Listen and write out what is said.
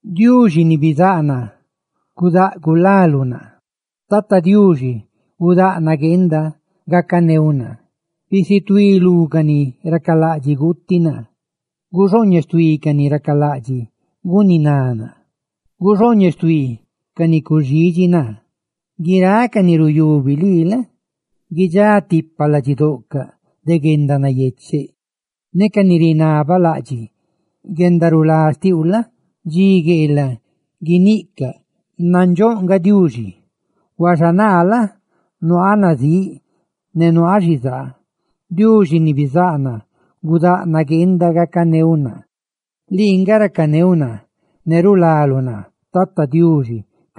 Diuxi ni bizáꞌ naa, ¡gudáꞌ gulaluꞌ naa! Tata Diuxi, ¡gudáꞌ nagueenda gacaneuꞌ naa! ¡Bisituí lú ca ni racalaꞌdxiꞌ guuti naa! ¡Guxooñeꞌ xtuí ca ni racalaꞌdxiꞌ guniná naa. ¡Guxooñeꞌ xtuí ca ni cuxidxi naa! Guiráꞌ ca ni ruyubi lii la? guidxá tipa ladxidoꞌcaꞌ de guendanayecheꞌ; ne ca ni rinabalaꞌdxiꞌ guendarulá xtiuꞌ la? dxi gueelaꞌ guiniꞌcaꞌ: «¡Nandxóꞌ nga Diuxi!» Huaxa naa la? nuaaꞌ nazíꞌ ne nuaaꞌ xizaa, Diuxi ni bizáꞌ naa, ¡gudáꞌ nagueenda gacaneuꞌ naa! Lii nga racaneuꞌ naa ne rulaluꞌ naa; ¡cadi guindoou, Tata Diuxi!